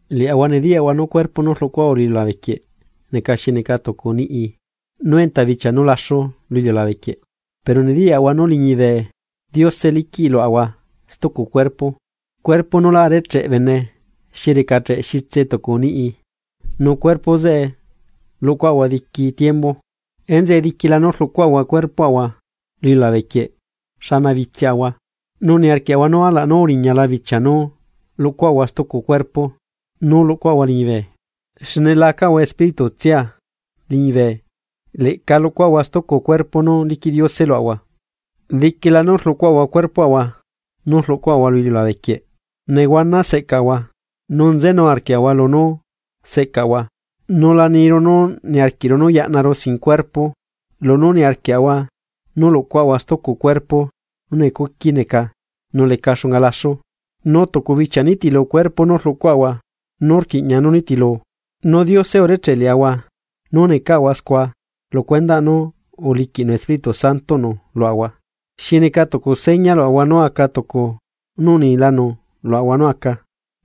Liaꞌahua nediyaꞌahua nú cuerpo nú rluꞌcuaꞌahua lu iliulabe quieꞌ neca xi neca tucu niꞌi nú enta bichia nú laxu lu iliulabe quieꞌ, pero nediyaꞌahua nú liñibe Diose liquiꞌ luaꞌahua stucu cuerpo, cuerpo nú lá arecheꞌ bene xi recacheꞌ xitse tucu niꞌi nu cuerpo zeꞌe luꞌcuaꞌahua diqui tiembu. Enzeꞌe diquila nú rluꞌcuaꞌahua cuerpoꞌahua lu iliulabequieꞌ xana bitsiꞌahua, nu niarquiaꞌahua nú alaꞌ nú uriñala bichia nú luꞌcuaꞌahua stucu cuerpo nú luꞌcuaꞌahua liñibe. Xne la acaꞌahua Espíritutsia liñibe leꞌca luꞌcuaꞌahua stucu cuerpo nú liquiꞌ Diose luaꞌahua. Diquila nú rluꞌcuaꞌahua cuerpoꞌahua nú rluꞌcuaꞌahua lu iliulabe quieꞌ nehuana seꞌcaꞌahua nu nzenu arquiaꞌahua lunú seꞌcaꞌahua. Nu la niru nú niarquiꞌru nú yaꞌnaru sin cuerpo lunú niarquiaꞌahua nú luꞌcuaꞌahua stucu cuerpo nú necuqui neca nú leca xunga laxu, nú tucu bichia nitilu, cuerpo nú rluꞌcuaꞌahua nú rquiꞌña nú nitilu. Nu Diose urecheꞌ liaꞌahua nú necaꞌahua scua lu cuendaꞌ nú uliquiꞌnu Espíritu Santoꞌnu luaꞌahua, xi neca tucu seña luaꞌahua nú aca tucu nú unilanu luaꞌahua nú aca.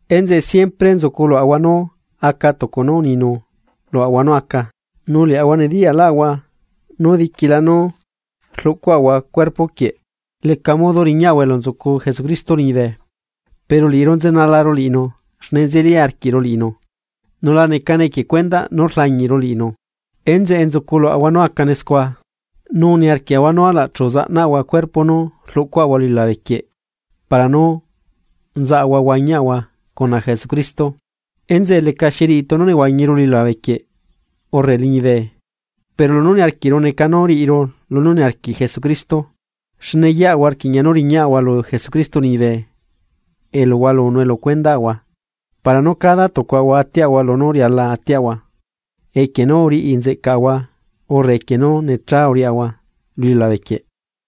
Enzeꞌe siempre nzuculuaꞌahua nú aca tucu nú uninu luaꞌahua nú aca, nu liaꞌahua nediyalaꞌahua nú diquila nú rluꞌcuaꞌahua cuerpo quieꞌ leca modo riñaꞌahua elu nzucu Jesucristo liñibe. Pero liꞌiru nzenalaru liꞌinu xne nzeli arquiꞌru liꞌinu nu la necane equie cuendaꞌ nú rlañiꞌru liꞌinu. Enzeꞌe nzucu luaꞌahua nú acane scua, nu niarquiaꞌahua nú alaꞌ chu zaꞌnaꞌahua cuerpo nú rluꞌcuaꞌahua lu iliulabe quieꞌ para nú nzaꞌahua huañiaꞌahua cuna Jesucristo. Enzeꞌe lecaxi riꞌi tunu nehuañiru lu iliulabe quieꞌ urre liñibe, pero lunú niarquiꞌru neca nú riꞌiru lunú niarquiꞌ Jesucristo. Xne yeꞌahua rquiꞌña nú riñaꞌahua lu Jesucristo liñibe elu hualunue lu cuendaꞌahua para nú cada tucuaꞌahua atiaꞌahua lunú riala atiaꞌahua, equie nú uriꞌi nzeꞌcaꞌahua urre equie nú necha uriaꞌahua lu iliulabequieꞌ.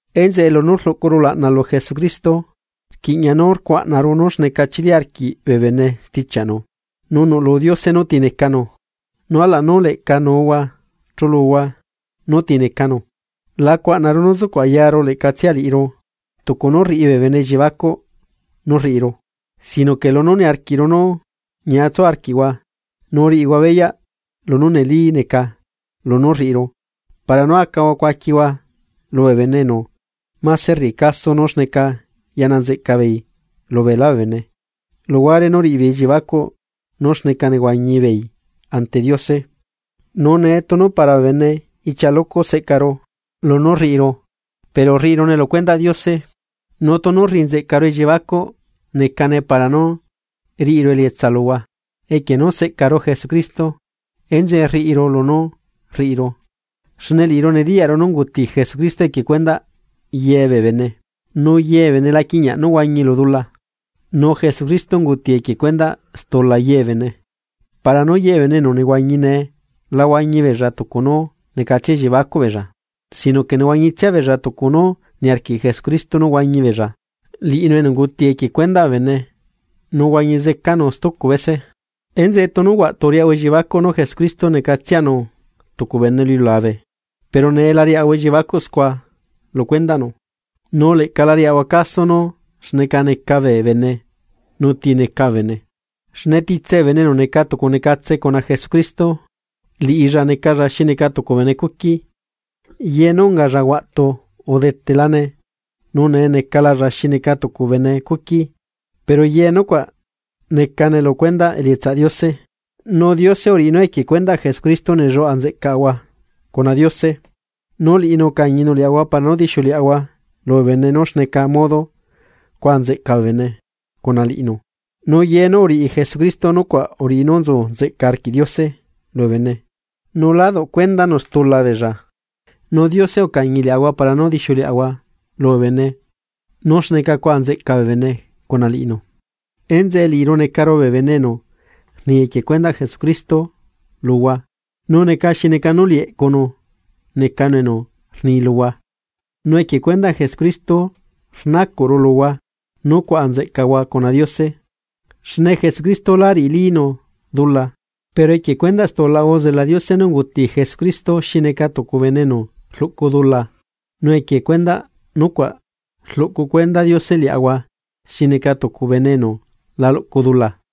Enzeꞌe lunú rluꞌcuru ulaꞌna lu Jesucristo, rquiꞌña nú rcuaꞌnaru nú xneca chili arquiꞌ bee bene stichiaꞌnu. Nu nuꞌlu Diose nú ti necanu, nu alaꞌ nú leꞌca nuuhua chuluhua nú ti necanu. La cuaꞌnaru nú sucuꞌ ayaru leꞌcatsia liꞌiru tucu nú rriꞌi bee bene elliebacuꞌ nú rriꞌiru, sino que lunú niarquiꞌru nú ñiatsu arquiꞌhua nu riꞌihua beyaꞌ lunú neli neca lunú rriꞌiru, para nú acahua cuaquihua lubee bene enu máse rriꞌi caso nú xneca yaꞌna nzeꞌca beei lubeelá bee bene luhuare nú riꞌi beei elliebacuꞌ nú xneca nehuañi beei ante Diose. Nu nee tunu para bee bene ichia lucu seꞌcaru lunú rriꞌiru pero rriꞌirune lu cuendaꞌ Diose. Nu tunu rriꞌinzeꞌcaru elliebacuꞌ necane para nú riꞌiru elietsa luhua. Equie nú seꞌcaru Jesucristo enzeꞌe rriꞌiru lunú rriꞌiru, xne liꞌiru nediyaꞌru nú unguti Jesucristo equie cuendaꞌ ye bee bene, nu ye bee bene la quiꞌñaꞌ nú huañi lu dula. Nu Jesucristo unguti equie cuendaꞌ stula ye bee bene, para nú ye bee bene enu nehuañi nee la huañi beella tucu nú necatsia elliebacuꞌ beella, sino que nehuañitsia beella tucu nú niarquiꞌ Jesucristo nú huañi beella, liꞌinu enu unguti equie cuendaꞌ bee bene nu uhuañi zecanu stucu bese. Enzeꞌe tunu huaꞌtu uriaꞌahua elliebacuꞌ nú Jesucristo necatsianu tucu bene lu iliulabe, pero nee la riaꞌahua elliebacuꞌ scua lu cuendaꞌnu. Nu leꞌca la riaꞌahua caso nú xneca neca bee bene nu ti neca bee bene, xne titse bee bene enu neca tucu necatsela cuna Jesucristo, liꞌilla necalla xi neca tucu bene cuqui, ye nú ungalla huaꞌtu udetelane nu nee necalalla xi neca tucu bene cuqui. Pero ye nucuaꞌ necane lu cuendaꞌ elietsaꞌ Diose, nu Diose uriꞌi nú equie cuendaꞌ Jesucristo nelluaꞌa nzeꞌcaꞌahua cuna Diose, nu liꞌinu ucañinu liaꞌahua para nú dixiuleꞌahua lubee bene nú xneca modo cuaꞌa nzeꞌca bee bene cuna liꞌinu. Nu ye nú uriꞌi Jesucristo nucuaꞌ uriꞌi nú nzu nzeꞌca arquiꞌ Diose lubee bene nu lá duꞌ cuendanu stula beella nu Diose ucañi liaꞌahua para nú dixiuleꞌahua lubee bene nú xneca cuaꞌa nzeꞌca bee bene cuna liꞌinu. Enzeꞌe liꞌiru necaru bee bene enu rni equie cuendaꞌ Jesucristo luhua, nu neca xi neca nú liꞌi eꞌcunu necanu enu rni luhua. Nu equie cuendaꞌ Jesucristo rnacuꞌru luhua nú cuaꞌa nzeꞌcahua cuna Diose. Xne Jesucristo lá riꞌilinu dula, pero equie cuendaꞌ stulaꞌahua uzela Diose nú unguti Jesucristo xi neca tucu bene enu rluꞌcu dula nu equie cuendaꞌ nucuaꞌ rluꞌcu cuenda Diose liaꞌahua xi neca tucu bene enu la luꞌcu dula.